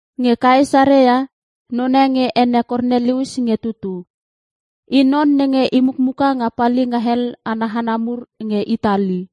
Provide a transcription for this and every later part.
Nge Kaesarea, none nge ene Kornelius nge tutu. I non nenge i mukmuka nga palinga hel ana hana mur nge Itali.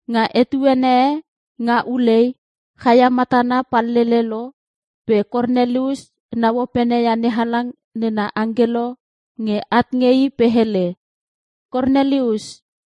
Nga etuene e nga ulei, chaia matana pallele lo pe Kornelius nau opene ia NeHalang nena angkelo nge at nge i pe hele, “Kornelius!”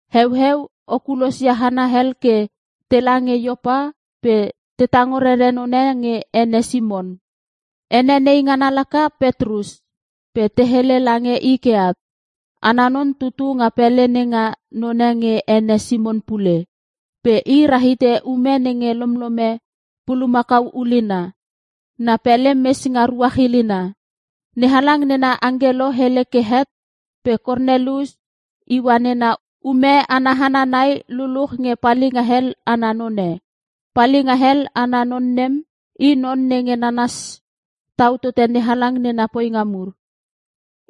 Heueu, o kulosia hana hel ke tela nge Iopa pe te tango rere none nge ene Simon. Ene nei ngana laka, Petrus. Pe te hele lange i ke at. Ana non tutu nga pele nenga none nge ene Simon pule. Pe i rahite ume nenge lomlome pulamakau ulina. Na pele mes nga ruach ilina.” NeHalang nena angkelo hele ke het, pe Kornelius iua nena ume ana hana nai luluch nge palinga hel ana none. Palinga hel ana non nem, i non nenge nanas tau tote NeHalang nena poinga mur.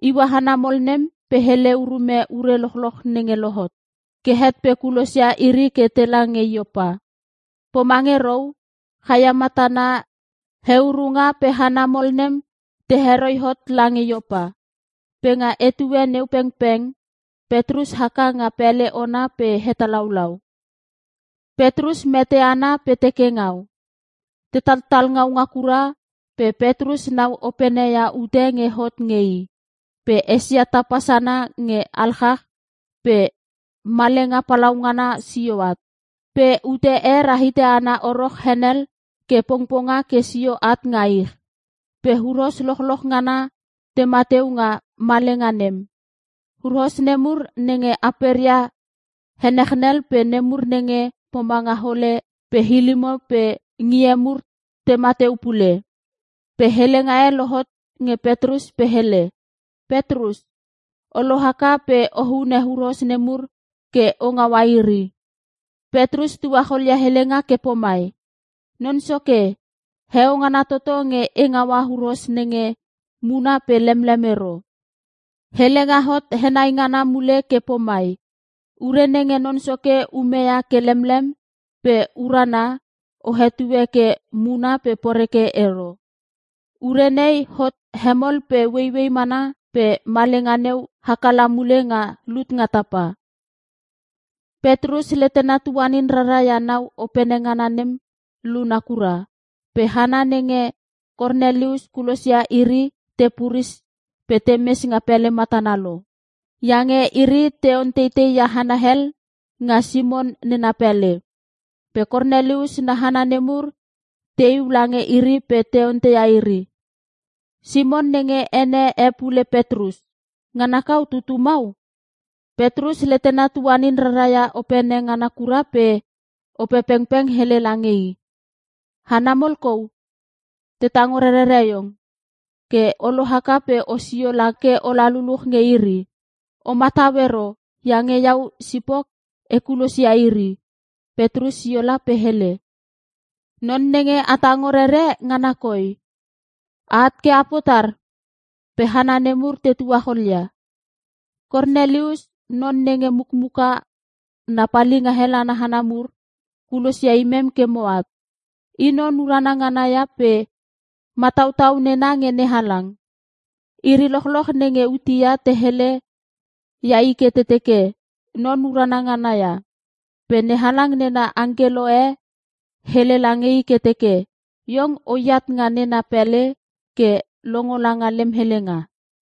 Iua hana mol nem pe hele urume ure lochloch nenge lohot. Ke het pe kulosia iri ke tela nge Iopa. Pomange rou, chaia matana heurunga pe hana mol nem te heroi hot lange Iopa. Pe nga etue neu pengpeng, Petrus haka nga pele ona ke hetalaulau. Petrus mete ana pe teke ngau. Te tatatal ngaunga kura, pe Petrus nau opene ia ute nge hot nge i. Pe esia tapa sana nge alchach pe malenga palaungana sio at. Pe ute e rahite ana oro henel ke pongponga ke sio at nga ich. Pe huros lochloch ngana tema teu nga malenga nem. Huros nemur nenge aperia henechnel pe nemur nenge pomanga hole pe hilimo pe ngie mur tema teu pule. Pe helenga e lohot nge Petrus pe hele, “Petrus, o lohaka pe o hune huros nemur ke o ngaua iri.” Petrus tuacholia helenga ke pomai, “Non Soke, heo ngana toto nge e ngaua huros nenge muna pe lemlem ero.” Helenga hot henei ngana mule ke pomai, “Ure nenge Non Soke ume ia ke lemlem pe urana, o hetue ke muna pe poreke ero.” Ure nei hot hemol pe ueiuei mana pe malenga neu haka la mule nga lut nga tapa. Petrus letena tuanin rara ia nau opene ngana nem luna kura, pe hana nenge Kornelius kulos ia iri te puris pe temes nga pele matana lo. Iange iri te onteitei ia hana hel nga Simon nena pele. Pe Kornelius na hana nemur teiu lange iri pe te onteia iri, “Simon nenge ene e pule Petrus, ngana kau tutu mau?” Petrus letena tuanin rara ia opene ngana kura pe Opepengpeng hele lange i, “Hana mol kou, te tango rerere iong. Ke o lohaka pe osio la ke ola luluch nge iri. O matau ero iange iau sipok e kulos ia iri.” Petrus sio la pe hele, “Non nenge a tango rere, ngana koi. A at ke a potar?” Pe hana nemur te tuacholia, “Kornelius, non nenge mukmuka na palinga hel ana hana mur, kulos ia imem ke moat. I non urana ngana ia pe matautau nena nge NeHalang. Iri lochloch nenge Iutea te hele ia i ke teke non urana ngana ia. Pe NeHalang nena angkelo e hele lange i ke teke iong oat nga nena pele ke longo langa lem helenga.”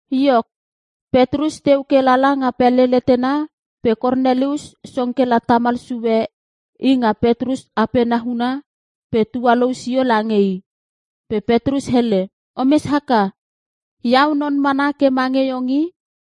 Iok, Petrus teu ke lala nga pele letena pe Kornelius song kela tamal sue i nga Petrus apena huna pe tualou sio lange i. Pe Petrus hele, “Omes haka, iau non mana ke mange iong i.”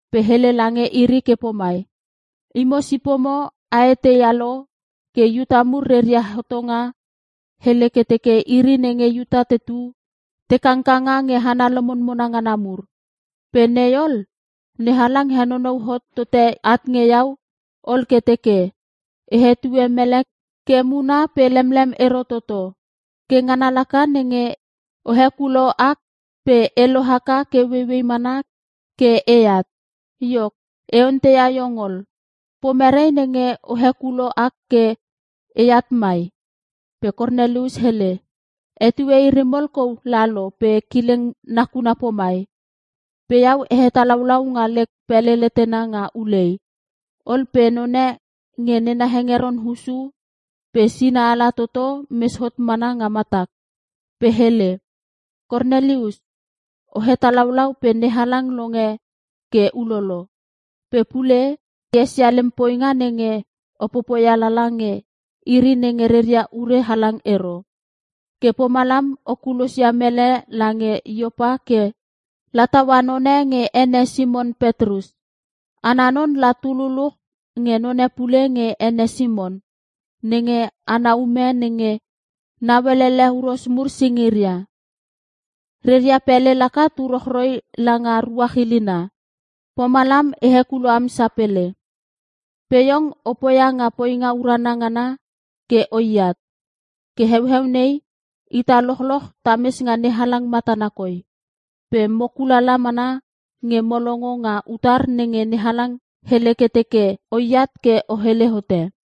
Pe hele lange iri ke pomai, “Imo sipomo a eteia lo ke Iuta mur reria hotongo hele ke teke iri nenge Iuta tetu ke te kangkanga nge hana lomonmona ngana mur. Pe nei ol, NeHalang henonou hot tote at nge iau ol ke teke, E hetue mele ke muna pe lemlem ero toto. Ke ngana laka nenge o hekulo ak pe e lohaka ke ueiuei mana ke eat. Iok, e onteia iong ol, pomere nenge o hekulo ak ke eat mai?” Pe Kornelius hele, “Etue iri mol kou lalo pe kileng nakuna pomai. Pe iau e hetalaulau nga lek pele letena nga ulei. Ol pe none nge nena hengeron hussu pe sina ala toto mes hot mana nga matak, pe hele, ‘Kornelius! O hetalaulau pe NeHalang longe ke ulolo. Pe pule, esia lem poinga nenge o popoia lala nge iri nenge reria ure halang ero. Ke pomalam o kulosia mele lange Iopa ke lataua none nge ene Simon Petrus. Ana non la tu luluch nge none pule nge ene Simon, nenge ana ume nenge nauelele huros mur singiria. Reria pele laka tu rochroi langa ruach ilina.’ Pomalam e hekulo am sapele. Pe iong o poia nga poinga urana ngana ke oiat. Ke heueu nei, ita lochloch tames nga NeHalang matana koi, pe mo kulala mana nge mo longo nga utar nenge NeHalang hele ke teke oat ke o hele hote.”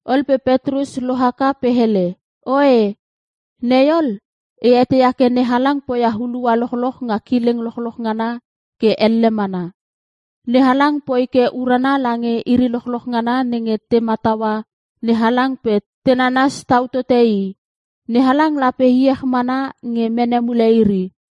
Ol pe Petrus lohaka pe hele, “Oe, nei ol e eteia ke NeHalang poia hulua lochloch nga kileng lochloch ngana ke elle mana. NeHalang poi ke urana lange iri lochloch ngana nenge te mataua NeHalang pe te nanas tau tote i, NeHalang lape iech mana nge mene mule iri.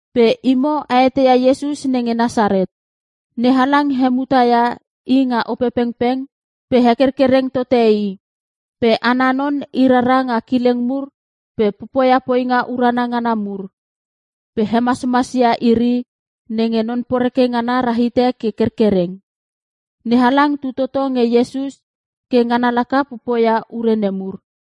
Pe imo a eteia Iesus nenge Nasaret. NeHalang hemuta ia i nga Opepengpeng pe hekerkereng tote i. Pe ana non i rara nga kileng mur pe popoia poinga urana ngana mur. Pe hemasmas ia iri nenge Non Poreke ngana rahite ke kerkereng. NeHalang tu toto nge Iesus ke ngana laka popoia ure nemur.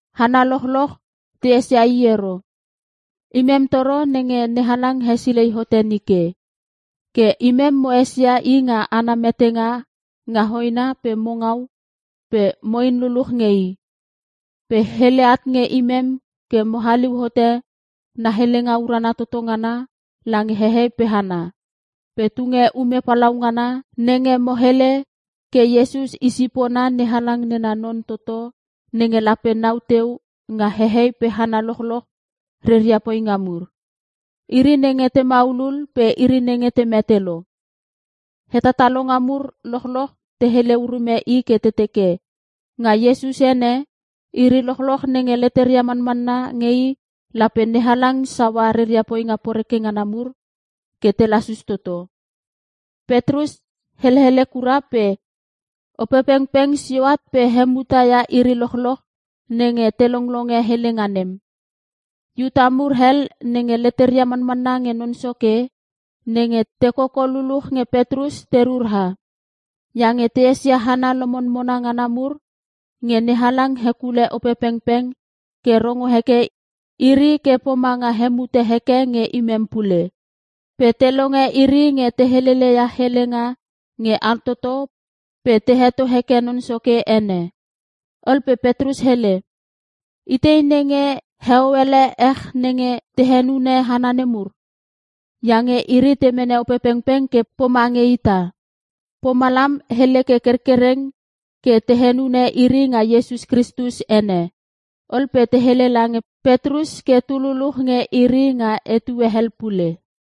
Hana lochloch te esia i ero. Imem toro nenge NeHalang hesilei hote nike. Ke imem mo esia i nga ana metenga nga hoena pe mo ngau pe mo in luluch nge i. Pe hele at nge imem ke mo haliu hote na helenga urana toto ngana lange hehei pe hana. Pe tunge ume palaungana nenge mo hele ke Iesus i sipona NeHalang nena non toto nenge lape nau teu nga hehei pe hana lochloch reria poinga mur. Iri nenge te maulul pe iri nenge te mete lo. Hetatalonga mur lochloch te hele urume i ke te teke, Nga Iesus ene, iri lochloch nenge leteria manmanna nge i lape NeHalang saua reria poinga poreke ngana mur ke te lasus toto.” Petrus helele kura pe Opepengpeng sio at pe hemuta ia iri lochloch nenge te longlonge helenga nem. Iuta mur hel nenge leteria manmanna nge Non Soke, nenge te koko luluch nge Petrus te rura. Iange te esia hana lomonmona ngana mur nge NeHalang hekule Opepengpeng ke rongo heke iri ke pomanga hemuta heke nge imem pule. Pe te longe iri nge te helele ia helenga nge altoto pe te heto heke Non Soke ene. Ol pe Petrus hele, “Itei nenge heo ele ech nenge te henune hana nemur? Iange iri te mene Opepengpeng ke pomange ita.” Pomalam hele ke kerkereng ke te henune iri nga Iesus Kristus ene. Ol pe te hele lange Petrus ke tu luluch nge iri nga etue hel pule.